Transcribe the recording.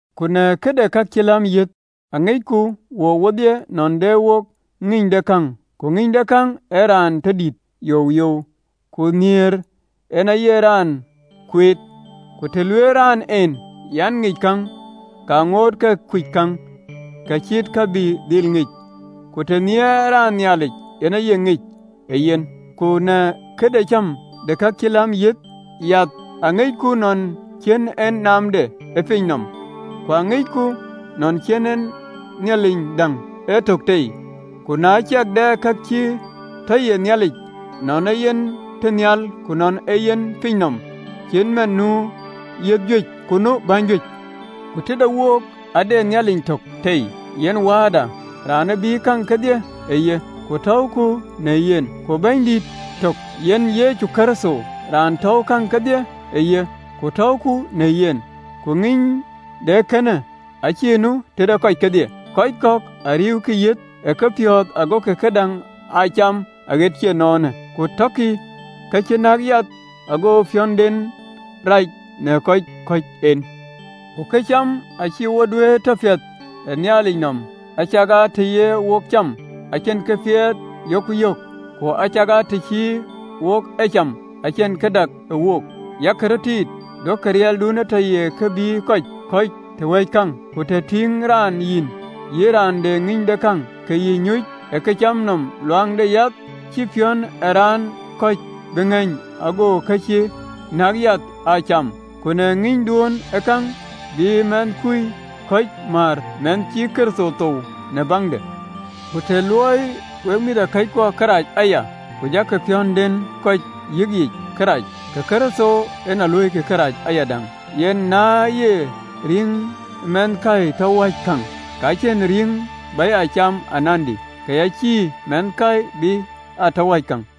Ku në këde ka cï läm yiëth, Aŋicku wook wodhie nɔn de wo ŋïnydekäŋ. Ku ŋïnydekäŋ ee raan rɔt tɔ dït youyou, ku nhiëër en aye raan kueet. Ku të lueelë raan en, an, ŋic käŋ, ke ŋoot ke kuc käŋ kë cït kë bï dhil ŋic. Ku të nhiɛɛrë raan Nhialic, yen aye ŋic ë ye. Ku në këde cäm de ka cï läm yiëth, yath aŋicku nɔn cïn en naamde ë piny nɔm, ku aŋicku nɔn cïn en Nhialic däŋ ee tök tei. Ku na ciɛk dɛ ka cï tɔ ye yiëth: nɔn ee yen tënhial ku nɔn ee yen ë piny nɔm, cït man nu yiëth juëc, ku nu bäny juëc, ku të de wook ade Nhialic tök tei, yen Wääda, Aciëŋ ë bïï käŋ kedhie ë ye, ku tɔ̈uku në yen, ku Bɛ̈nydït tök, yen Yecu Kërtho, raan tɔ̈uwë käŋ kedhie ë ye, ku tɔ̈uku në yen. Ku ŋïny de ee kënë acïï nu tëde kɔc kedhie: kɔc kɔ̈k a riëëukï yiëth ë kepiɔ̈ɔ̈th, gokï këdäŋ aa cam aɣet cï ënɔɔnë, ku tɔkï ë ke cï nɔ̈k yath, ago piɔ̈nden rac në kɔ̈c kɔ̈ɔ̈c en jɔ dhiöök. Ku këcam acïï wo duëër tɔ piɛth ë Nhialic nɔm: acakaa të ye wok cam, acïn këpiɛth yok yök, ku acakaa të cïï wok ee cath, acïn kë dak wook. Yak röt tiit, duökï riɛlduönë tɔ ye kë bï kɔc kɔ̈c tɔ wäc käŋ. Ku të tïŋë raan yïn, yïn raan de ŋïnydekäŋ, ke yï nyuc ë këcam nɔm luaŋ de yath, cïï piɔ̈n ë raan kɔ̈c bï ŋeeny ago ka cï näk yiëth aa cam? Ku në ŋïnyduön ë käŋ, bï mɛnhkui kɔ̈c määr, mɛnh cï Kërtho thou në baŋde? Ku të luöi wek mïthëkɔckuɔ kërac aya, ku jɔkï piɔ̈ndɛn kɔ̈c yiëkic kërac, ke Kërtho en a luöikï kërac ayadäŋ. Yen na ye rïŋ mɛnhkäi tɔ wäc käŋ, ka cïn rïïŋ bä ya cam anandï, ke ya cïï mɛnhkäi bï aa tɔ wäc käŋ.